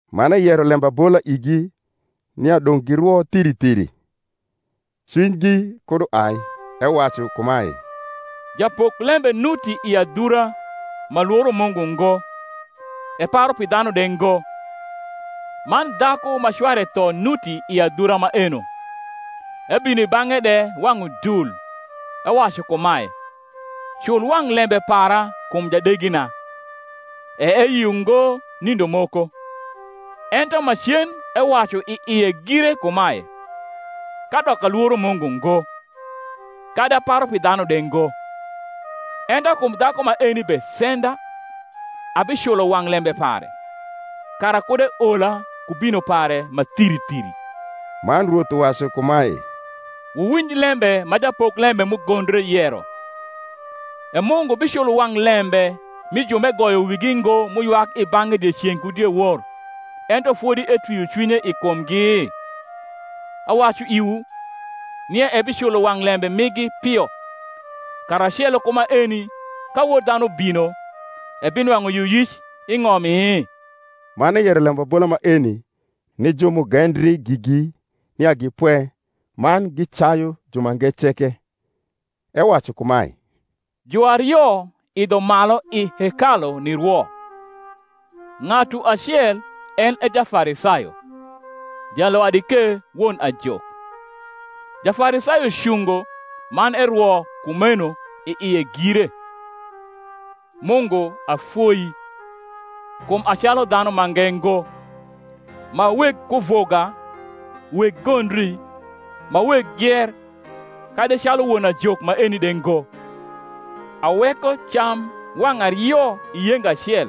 Man eyero lembabola igi nia dong’ girwo thiri thiri, cwinygi kud uai; ewacu kumae, Japoklembe nuti i adhura, ma lworo Mungu ngo, eparu pi dhanu de ngo: man dhaku ma cware tho nuti i adhura maeno; ebino i bang’e de wang’ udul, ewacu kumae, Cul wang’ lembe para kum jadegina. E eyio ngo nindo moko: ento macen ewacu i ie gire kumae, Kadok alworo Mungu ngo, kadi aparu pi dhanu de ngo; ento kum dhaku maeni besenda, abiculo wang’ lembe pare, kara kud eola ku bino pare ma thiri thiri. Man Rwoth uwacu kumae, Wuwinj lembe ma japoklembe m’ugondre yero. E Mungu biculo wang’ lembe mi ju m’egoyo wigi ngo m’uywak i bang’e dieceng’ ku diewor, ento fodi etwio cwinye i kumgi? Awacu iwu, nia ebiculo wang’ lembe migi pio. Karacelo ku maeni, ka Wod dhanu bino, ebinwang’u yioyic i ng’omi? Man eyero lembabola maeni ni ju m’ugendri gigi nia gi pwe, man gicayu jumange ceke: ewacu kumae, Juario idho malu i hekalu nirwo; ng’atu acel en e Jafarisayo, jalwadi ke won ajok. Jafarisayo cungo man erwo kumeno i ie gire, Mungu, afoii, kum a calu dhanu mange ngo, ma weg kuvuga, weg gondri, ma weg gier, kadi calu won ajok maeni de ngo. Aweko cam wang’ ario i yenga acel,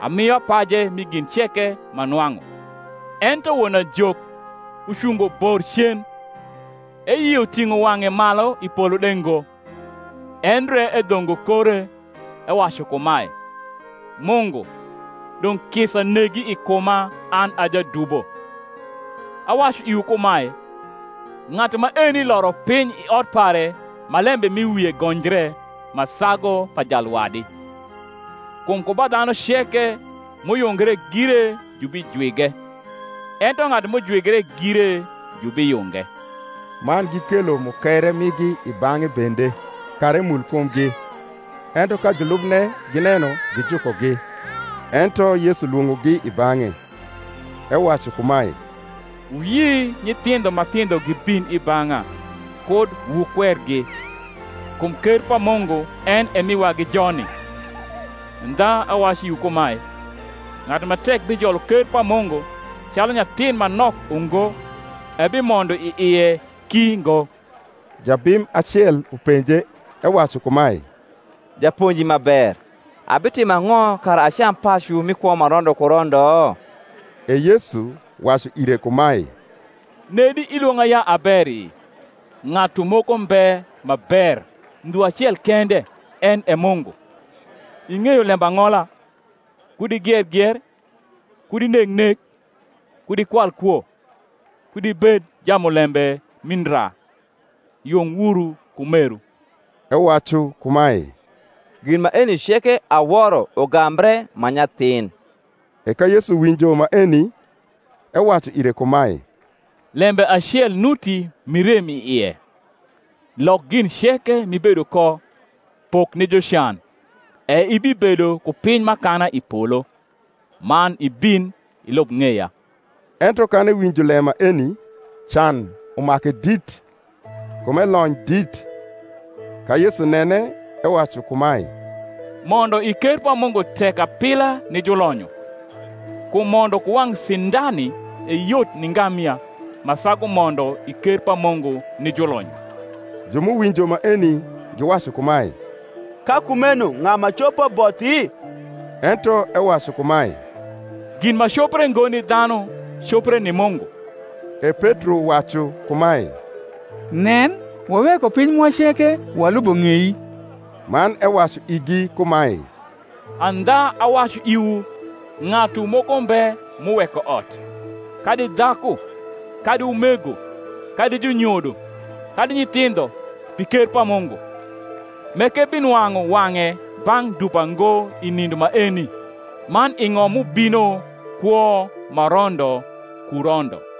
amio apaje mi gin ceke m’anwang’u. Ento won ajok, ucungo bor cen, eyio ting’o wang’e malu i polo de ngo, endre edhongo kore, ewacu kumae, Mungu, dong’ kisa negi i kuma an a jadubo. Awacu iwu kumae, Ng’atu maeni loro piny i ot pare ma lembe m’i wie gonjre ma sagu pa jalwadi: kum ku ba dhanu ceke m’uyungre gire jubijwige; ento ng’atu m’ujwigre gire jubiyunge. Man gikelo mukere migi i bang’e bende, kara emul kumgi: ento ka julubne gineno, gijukogi. Ento Yesu lwong’ogi i bang’e, ewacu kumae, Wuyi nyithindho ma thindho gibin i bang’a, kud wukwergi: kum ker pa Mungu en e mi wagi joni. Andha awacu iwu kumae, Ng’atu ma tek bijolo ker pa Mungu calu nyathin ma nok ungo, ebimondo i ie ki ngo. Jabim acel upenje, ewacu kumae, Japonji ma ber, abitimo ang’o kara acam pacu mi kwo ma rondo ku rondo? E Yesu wacu ire kumae, Nedi ilwong’a ya a beri? ng’atu moko mbe ma ber, ndhu acel kende, en e Mungu. Ing’eyo lembang’ola, Kud igier gier, Kud ineg nek, Kud ikwal kwo, Kud ibed jamulembe mi ndra, Yung wuru ku meru. Ewacu kumae, Gin maeni ceke aworo ugambre m’a nyathin. E ka Yesu winjo maeni, ewacu ire kumae, Lembe acel nuti m’irem i ie: lok gin ceke m’ibedo ko, pok ni jucan, e ibibedo ku piny m’akana i polo: man ibin, ilub ng’eya. Ento kan ewinjo lem maeni, can umake dit; kum elony dit. Ka Yesu nene ewacu kumae, Mondo i ker pa Mungu tek apila ni julonyo! Kum mondo ku wang’ sindani e yot ni ngamia, ma sagu mondo i ker pa Mungu ni julonyo. Ju m’uwinjo maeni giwacu kumae, Ka kumeno ng’a ma copo bothi? Ento ewacu kumae, Gin ma copre ngo ni dhanu copre ni Mungu. E Petro wacu kumae, Nen, waweko piny mwa ceke, walubo ng’ei. Man ewacu igi kumae, Andha awacu iwu, Ng’atu moko mbe m’uweko ot, kadi dhaku, kadi umego, kadi junyodo, kadi nyithindho, pi ker pa Mungu, m’ekebinwang’u wang’e bang’ dupa ngo i nindo maeni, man i ng’om m’ubino kwo ma rondo ku rondo.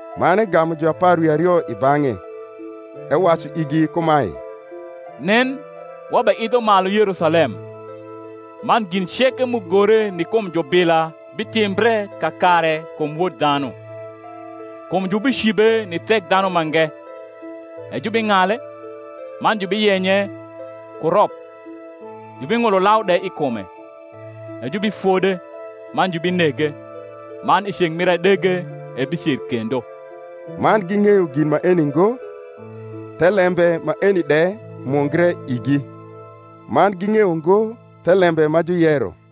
Man egamu juapar wi ario i bang’e, ewacu igi kumae, Nen, wabeidho malu Yerusalem, man gin ceke m’ugore ni kum jubila bitimbre kakare kum Wod dhanu. Kum jubicibe ni Thekdhanumange, e jubing’ale, man jubiyenye ku rop, jubing’ulo lau de i kume: e jubifode man jubinege: man i ceng’ mir adege ebicer kendo. Man ging’eyo gin maeni ngo; thelembe maeni de mungre igi, man ging’eyo ngo thelembe ma juyero.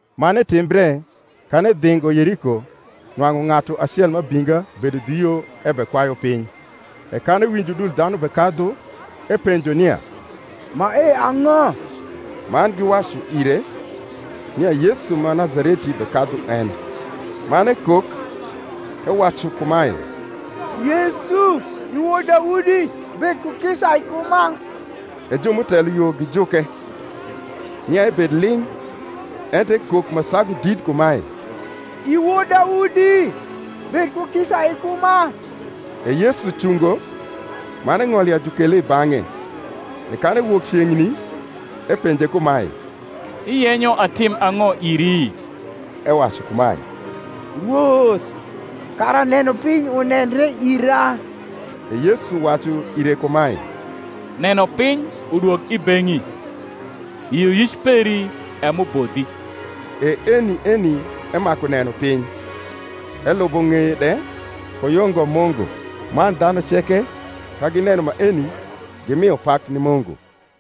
Man etimbre, kan edhingo Yeriko, nwang’u ng’atu acel ma abinga bedo dhu yo ebekwayu piny: e kan ewinjo udul dhanu bekadhu, epenjo nia mae ang’o. Man giwacu ire, nia Yesu ma Nazareti bekadhu en. Man ekok, ewacu kumae, Yesu, i wod Daudi, bed ku kisa i kuma. E ju m’utelo yo gijuke, nia ebed ling’: ento ekok ma sagu dit kumae, I wod Daudi, bed ku kisa i kuma. E Yesu cungo, man eng’olo ya jukele i bang’e: e kan ewok ceng’ni, epenje kumae, Iyenyo atim ang’o iri? Ewacu kumae, Rwoth, kara nenopiny unendre ira. E Yesu wacu ire kumae, Nenopiny udwog i beng’i: yioyic peri e m’ubodhi. E eni eni emaku neno piny, elubo ng’eye de, ku yungo Mungu: man dhanu ceke, ka gineno maeni, gimio pak ni Mungu.